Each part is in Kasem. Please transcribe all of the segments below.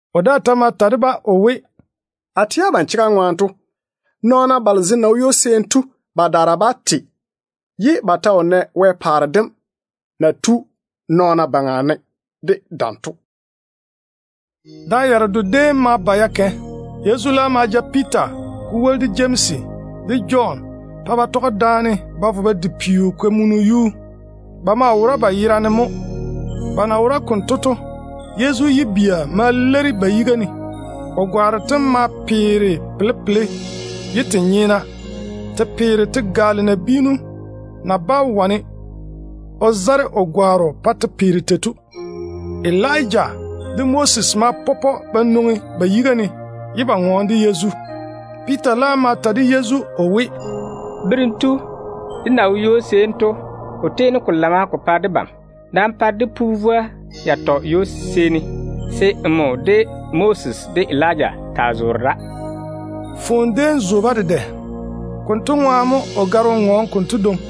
O daa ta ma ta de-ba o we, “A tɛ abam chega ŋwaane to, nɔɔna balo zem na wo ywo-seeni to badaara bá te ye ba ta wo nɛ Wɛ paare dem na tu nɔɔna baŋa ne de dam to.” Da yaredo déem ma ba ya kɛ. Yezu laam ma ja Piita ko woli de Jemsi de Jɔn pa ba tɔge daane ba vo ba di peo-kamunu yuu. Ba maa wora ba yerane mo. Ba na wora konto to, Yezu yibia ma leiri ba yiga ne. O gwaaro tem ma tiini te peere cha ye te nyeena. Te peere te gaale nabiinu na bá wane o zare o gwaaro pa te peere tei to. Elija de Moses ma pɔpɔ ba nwoŋi ba yiga ne, ye ba ŋɔɔne de Yezu. Piita laam ma ta de Yezu o we, “Berem tu, dé na wo ywo-seeni to, ko tiini ko lana ko pa debam. Nam pa dé pu vwoa yatɔ ywo-seeni, se nmo, de Moses, de Elija taa zoore da.” Foone déem zo-ba dedɛ. Konto ŋwaane mo o gare o ŋɔɔne konto dwoŋi.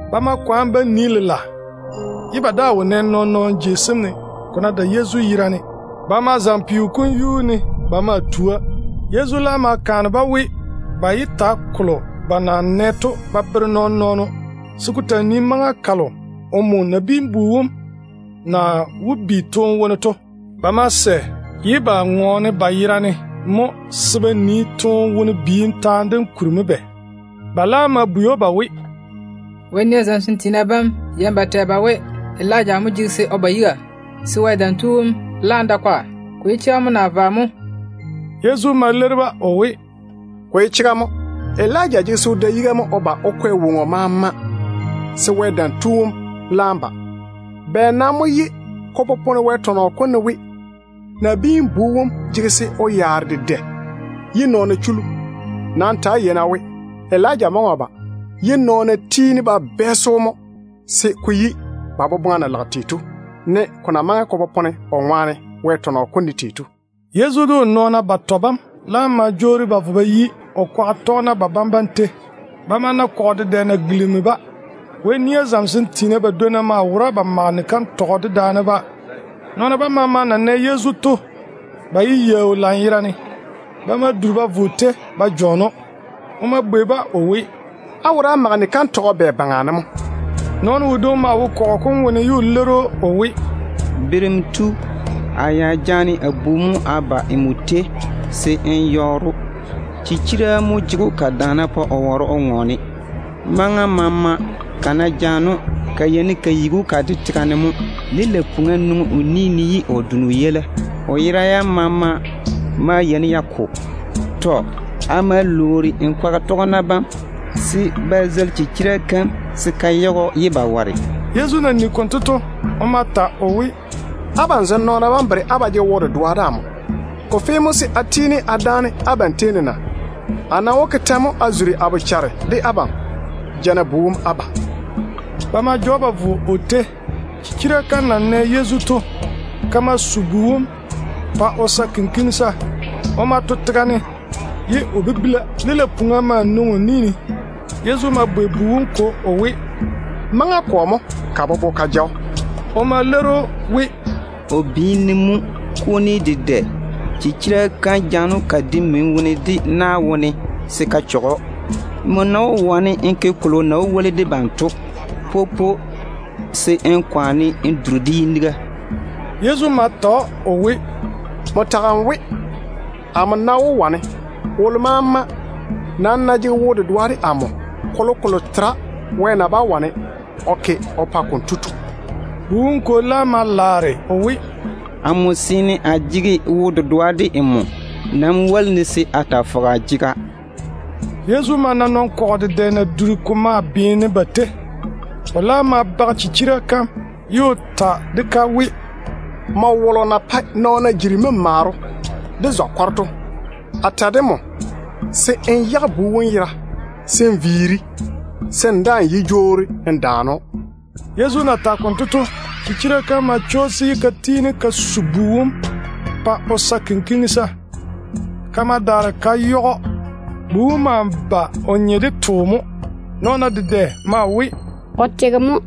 Ba ma kwaane ba nii lela, ye ba daa wo nɛ nɔɔn-nɔɔno jei sem ne, ko ná dae Yezu yerane. Ba ma zaŋe peo kom yuu ne ba maa tua. Yezu laam ma kaane-ba we, ba yé ta kolo ba na nɛ to ba bere nɔɔn-nɔɔno, se ko taa nii maŋa kalo omo Nabiin-bu wom na wó bi toone wone to. Ba ma sɛ ye ba ŋɔɔne ba yerane ba bwɛ ba nii, ka-bi-toone-wone taane dem kuri mo bɛ. Ba laam ma bwei‑o ba we, “Wɛ nia zamesem tiina bam yeini ba tɛ ba we, Elija mo jege se o ba yiga, se Wɛ Dam Tu wom laam da kwaga. Ko ye chega mo naa vwa mo?” Yezu ma leiri-ba o we, “Ko ye chega mo. Elija jege se o da yiga o ba o kwɛ woŋo maama se Wɛ Dam Tu wom laam ba. Bɛ nam mo ye ko popone Wɛ tɔnɔ kom ne we, Nabiin-bu wom jege se o yaare dedɛ ye nɔɔna chuli‑o? Nam ta‑á yei-na we, Elija maŋe o ba, ye nɔɔna tiini ba bɛɛse‑o se ko yi ba boboŋa na lage tei to, ne ko na maŋe ko popone o ŋwaane Wɛ tɔnɔ kom ne tei to.” Yezu de o nɔɔna batɔ bam laam ma jwoori ba vo ba yi o kwaga tɔgena babam tei. Ba ma na kɔgɔ dedɛ na gilimi-ba. Wɛ nia zamesem tiina badwonna maa wora ba mage ni-kantɔgɔ dedaane-ba. Nɔɔna bam maama na nɛ Yezu to, ko ke-ba yaau lanyerane. Ba ma duri ba vo o tei ba jɔɔne‑o. O ma bwei-ba o we, “Á wora á mage ni-kantɔgɔ bɛ baŋa ne mo?” Nɔɔno wodwoŋi maa wo kɔgɔ kom wone ye o leiri‑o o we, “Berem tu, a ya jaane a bu mo a ba nmo tei se n yɔɔre‑o. Chichira mo jege‑o ka daana pa o ware o ŋɔɔne. Maŋa maama, ka ná jaane‑o, ka yeini ka yigi‑o ka de tega ne mo. Lilei-puŋa nwoŋi o ni ne ye o done o yeila. O yera yam maama maa yeini ya ko. Tɔ. A ma lwoori nmo kwaga tɔgena bam se ba zeili chichira kam se ka yage‑o ye ba ware.” Yezu na nigi konto to, o ma ta o we, “Abam zem nɔɔna bam bere á ba jege wo-dedoa de amo. A nam wó tiini a dáane abam tei ne se ko vo ko maŋe yei ne mo? A nam wó ke tɛ mo a zuri a bochare de abam? Ja-na bu wom á ba.” Ba ma ja‑o ba vo o tei. Chichira kam na nɛ Yezu to, ka ma su bu wom pa o sa kɔɔro. O ma to tega ne ye o bibila. Lilei-puŋa ma nwoŋi o ni ne. Yezu ma bwei bu wom kwo o we, “Maŋa kɔ mo ka bobo ka ja‑o?” O ma leiri‑o we, “O biini ne mo. Kuni dedɛ chichira kam jaane‑o ka de mini wone, de na wone se ka chɔge‑o. Nmo ná wó wane n ke kolo na wó woli debam to, popo se n kwaane n duri debam yiniga.” Yezu ma ta‑o o we, “Nmo tage n we, amo ná wó wane. Wolo maama nam ná jege wo-dedoa de amo, kolokolo tera Wɛ na bá wane o ke o pa konto tu.” Bu wom kwo laam ma laare o we, “Amo seene a jege wo-dedoa de nmo. Nam woli-ne se a taa fɔge a jega.” Yezu ma na nɔn-kɔgɔ dedɛ na dura ko maa beene ba tei. O laam ma bage chichira kam ye o ta de-ka we, “Nmo wolo na pae nɔɔna jiri memaaro de zɔ-kɔro to, a ta de nmo se n yage bu wom yera n viiri, se n daa‑n yé jwoori n yaare‑o.” Yezu na tage konto to, chichira kam ma chwoosi ye ka tiini ka su bu wom pa o sa kɔɔro. Ka ma daare ka yage‑o. Ka na yage‑o to, bu wom laam nye de too mo. Nɔɔna dedɛ maa we, “O tege mo.”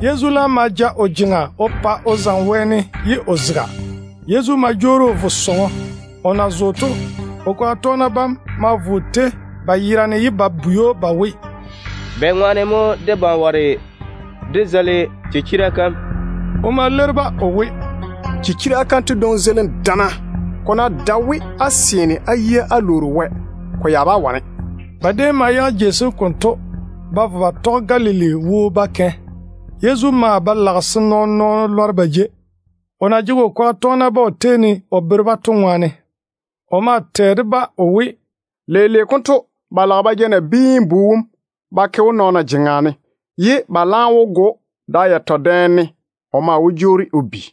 Yezu laam ma ja o jeŋa o pa o zaŋe wɛɛne ye o zega. Yezu ma jwoori o vo sɔŋɔ. O na zo to, o kwaga tɔgena bam ma vo o tei ba yerane ye ba bwei‑o ba we, “Bɛŋwaane mo debam ware dé zeili chichira kam?” O ma leiri-ba o we, “Chichira kanto dwoŋi zeilim chamma. Ko ná dae we á seene á yia á lwoori Wɛ, ko ya bá wane.” Ba déem ma yage jei sem konto ye ba vo ba tɔge Galili wo ba kɛ. Yezu maa ba lage se nɔɔn-nɔɔno lɔre ba jei, o na jege o kwaga tɔgena bam o tei ne ye o bere-ba to ŋwaane. O maa bere-ba o we, “Leile konto ba lage ba ja Nabiin-bu wom ba ke nɔɔna jeŋa ne, ye ba laam wó go‑o. Da yatɔ dɛ ne o maa wó jwoori o bi.”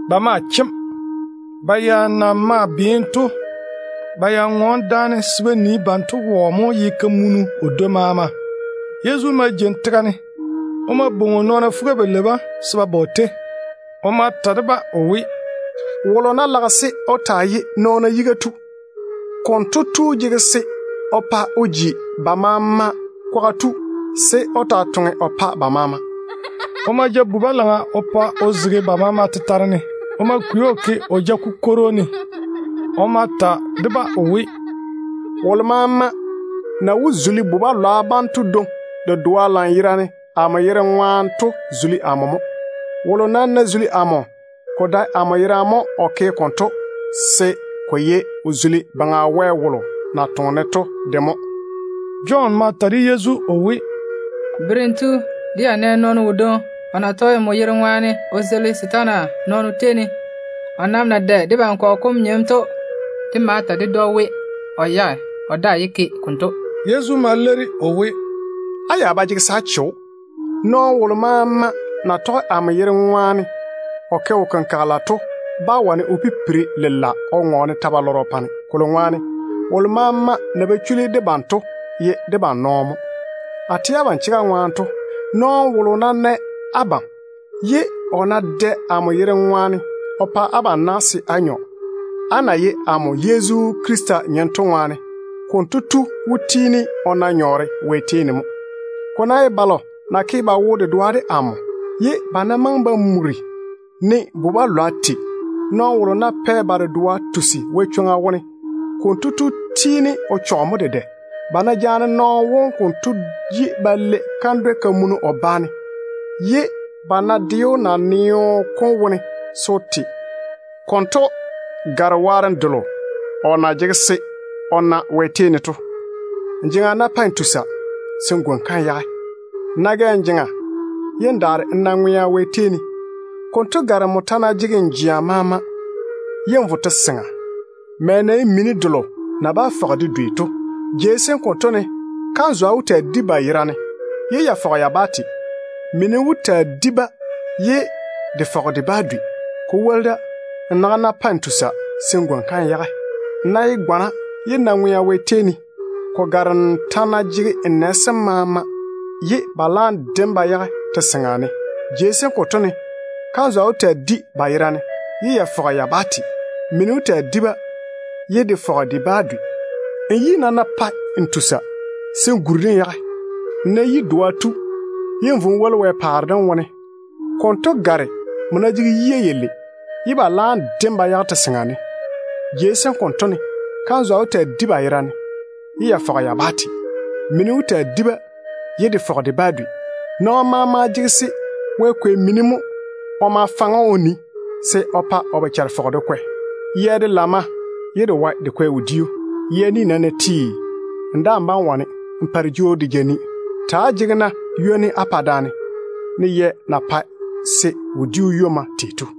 Ba ma chem. Ba ya na maa beene to, ba mage kantɔgɔ daane se ba nii, banto wone wɔ mo ye kamunu o dwoi maama. Yezu ma jeini tega ne. O ma bwoŋi o nɔɔna fuga-balei bam se ba ba o tei. O ma ta de-ba o we, “Wolo ná lage se o taa ye nɔɔna yiga tu, konto tu maŋe se o ji ba maama kwaga tu, se o taa toŋe o pa ba maama mo.” O ma ja bu-balaŋa o pa o zege ba maama tetare ne. O ma kwei‑o o ke o ja-kukworo ne. O ma ta de-ba o we, “Wolo maama na wó zuli bu-balwa banto dwoŋi dedoa lanyerane amo yere ŋwaane to zuli amo mo. Wolo nam ná zuli amo, ko dae amo yerane mo o ke konto, se ko ye o zuli Baŋa Wɛ wolo na toŋe-ne to de mo.” Jɔn ma ta de Yezu o we, “Berem tu, dé ya nɛ nɔɔno wodwoŋi o na tɔge nmo yere ŋwaane o zeili setaana nɔɔna tei ne. O nam na dae debam kɔgɔ kom nyem to, de ma ta ded‑o we, o yage, o daa yé taa ke konto.” Yezu ma leiri o we, “Á ya ba jege se á che‑o. Nɔɔno wolo maama na tɔge amo yere ŋwaane o ke wo-kenkagele to bá wane o pipiri lela o ŋɔɔne ta-balɔrɔ o pa-ne. Kolo ŋwaane wolo maama na ba chuli debam to ye debam nɔɔno mo. A tɛ abam chega ŋwaane to, nɔɔno wolo ná nɛ abam, ye o ná dɛ amo yere ŋwaane o pa abam na se á nyɔ, á na ye amo Yezu Krista nyem to ŋwaane, konto tu wó tiini o na nyɔɔre Wɛ tei ne mo. Ko ná ye balo na ke ba wo-dedoa de amo, ye ba ná maŋe ba muri ne bu-balwa tei, nɔɔno wolo ná pɛ ba dedoa tusi Wɛ chwoŋa wone, konto tu tiini o chɔge mo dedɛ. Ba ná jaane nɔɔno wom konto ba daare ba lei kandwɛ-kamunu o ba ne, ye ba ná de‑o naneo kom wone se o te, konto gare waarem delo kotu na jege se o na Wɛ tei ne to. Nmo jeŋa ná pae n tusa, se n gwoni-ka n yage. Nmo ná gɛ n jeŋa, ye n daare n na ŋwea Wɛ tei ne, konto gare nmo ta ná jege n jea maama ye n vo te-seŋa, mɛ na ye mini delo na bá fɔge de dwei to. [ Jei sem konto ne, ‘Toa wó taa mu ba yera ye ka fɔge ka bá te. Mini wó taa di-ba ye de fɔge de bá dwei.’] Ko woli da, nmo naga ná pae n tusa, se n gwoni-ka n yage. Nmo ná ye gwana ye n na ŋwea Wɛ tei ne, konto gare nmo ta ná jege n nɛ sem maama ye ba laam de‑m ba yage te-seŋa ne. [ Jei sem konto ne, ‘Toa wó taa mu ba yera ye ka fɔge ka bá te. Mini wó taa di-ba ye de fɔge de bá dwei.’] Nmo yi nam ná pae n tusa, se n guri-de n yage. Nmo ná ye yi-doa tu ye n vo n woli Wɛ paare dem wone, konto gare nmo ta ná jege yia yalei ye ba laam de‑m ba yage te-seŋa ne. Jei sem konto ne, ‘Toa wó taa mu ba yera ye ka fɔge ka bá te. Mini wó taa di-ba ye de fɔge de bá dwei.’ Nɔɔno maama jege se Wɛ kwei mini mo o ma faŋe‑o o nii, se o pa o bochare fɔge de kwɛ. Yɛ de lamma ye de wae de kwɛ wodiu. Yɛ ni nam ná ti, n daa‑n bá‑n wane n pa de jwoori de ja ni. Pa-na á wo taa ywomma da-ŋwaane, ne yɛ na pae wodiu ywomma tei to.”